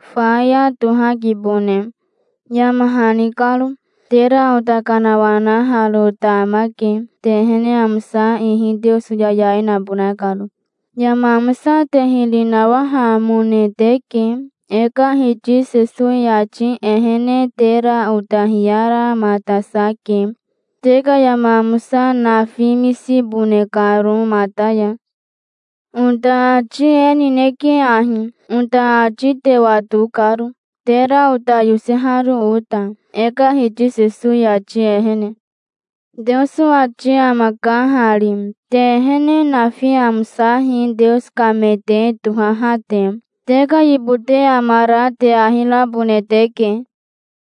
Faya tohakibone, yama hani karo. Tera ota kanawanaharo ota amake, te ehene amosa ihi Teoso yayai nabona karo. Yama amosa te hiri nawahamone teke. E ka Hiti Sesowi ati ehene tera ota hiyaramatasake, te ka yama amosa nafimisibone karo mata ya. Ota ati e nineke ahi, ota ati te wato karo, tera ota yoseharo ota, e ka Hiti Sesowi ati ehene. Teoso ati amaka hari: Te ehene nafi amosahi Teoso ka me te tohaha te. Te ka yibote amara te ahi rabone teke.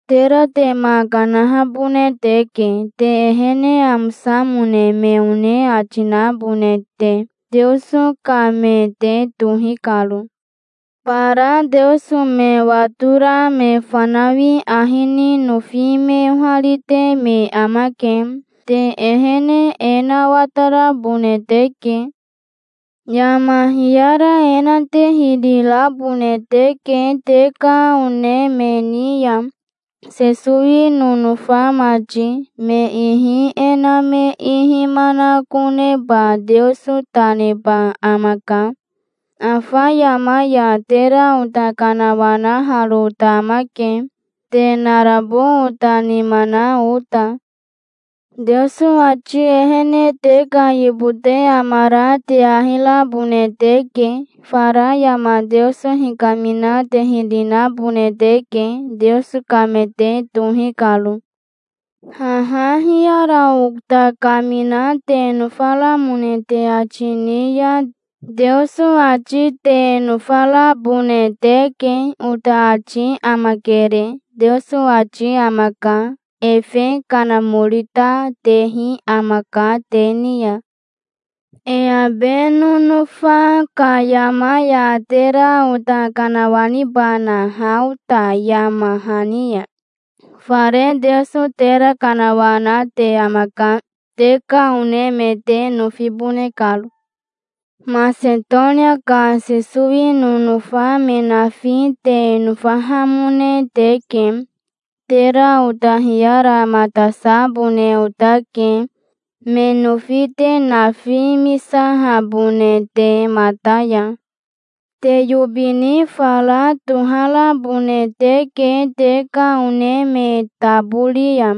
Tera te ma kanahabone teke, te ehene amosamone me one ati nabone te, Teoso ka me te tohi karo. Bara Teoso me watora me fanawi ahi ni nofi me oharite me amake. Te ehene e na watarabone teke. Yama hiyara e na te hiri rabone teke te ka one me ni ya, Sesowi nonofa mati. Me ihi e na me ihi manakoneba Teoso ta neba amaka. Afa yama ya tera ota kanawanaharo ota amake, te narabo ota nima na ota. Teoso ati ehene te ka yibote amara te ahi rabone teke. Fara yama Teoso hikamina te hiri nabone teke, Teoso ka me te tohi karo. Haha hiyara ota kamina te nofaramone te ati ni ya, Teoso ati te nofarabone teke. Ota ati amakere, Teoso ati amaka. Efe Kanamori ta tehi amaka te ni ya. E abe nonofa ka yama ya tera ota kanawanibana ha ota yama hani ya? Fare Teoso tera kanawanate amaka, te ka one me te nofibone karo. Masetonia ka Sesowi nonofa me nafi te nofahamone teke. Tera ota hiyaramatasabone otake, me nofi te nafimisahabone te mata ya. Te yobi ni fara toharabone teke te ka one me tabori ya.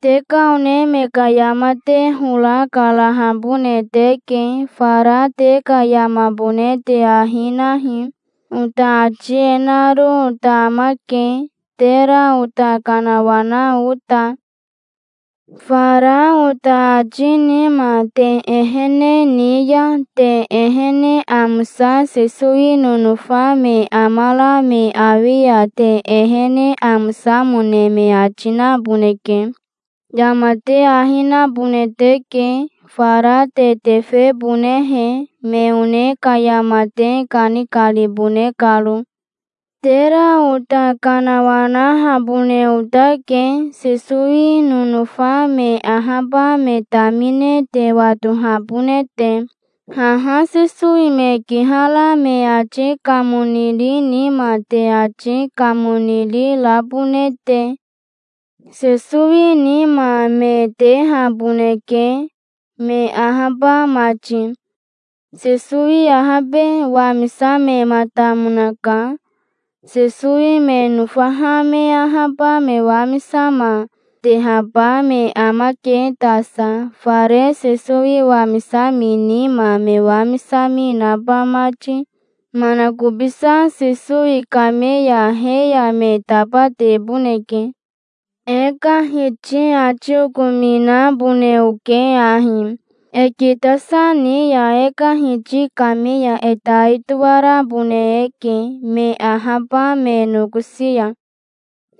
Te ka one me ka yama te hora karahabone teke. Fara te ka yamabone te ahi nahi. Ota ati e naro ota amake, tera ota kanawana ota. Fara ota ati nima te ehene ni ya, te ehene amosa Sesowi nonofa me amara me awi ya te ehene amosamone me ati naboneke. Yama te ahi nabone teke, fara te tefebonehe, me one ka yama te kanikaribone karo. Tera ota kanawanahabone otake, Sesowi nonofa me ahaba me tamine te watohabone te, haha Sesowi me kihara me ati kamoniri nima te ati kamoniri rabone te. Sesowi nima me tehaboneke, me ahaba mati. Sesowi ahabe, wamisamematamonaka. Sesowi me nofaha me ahaba me wamisama, tehaba me amake tasa, fare Sesowi wamisami nima me wamisami naba mati. Manakobisa Sesowi kame ya he ya me tabateboneke. E ka Hiti ati okominabone oke ahi. E kitasa ni ya e ka Hiti kame ya e tai toarabone eke, me ahaba me nokosi ya.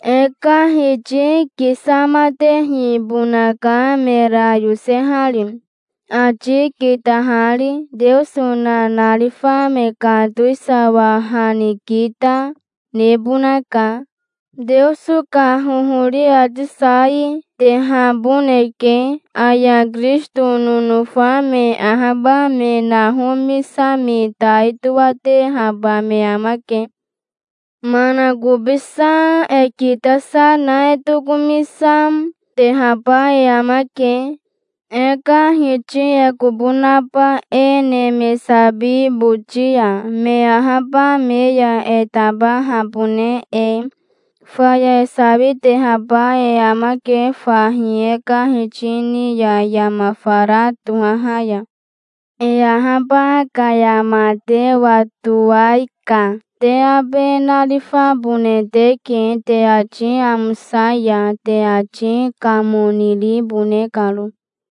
E ka Hiti kisamatehibonaka mera yosehari, ati kitahari. Teoso nanarifa me ka towisawa ha ni kita, nebonaka. Teoso ka hohori ati sai, tehaboneke. Aya Kirisito nonofa me ahaba me nahomisami tai toatehaba me amake. Manakobisa e kitasa na e tokomisa, tehaba e amake, e ka Hiti e kobo naba e neme sabi boti ya, me ahaba me ya e tabahabone e. Faya e sawitehaba e amake fahi e ka Hiti ni ya yama fara tohaha ya. E ahaba ka yama te watowai ka te abe narifabone teke, te ati amosa ya, te ati kamoniribone karo.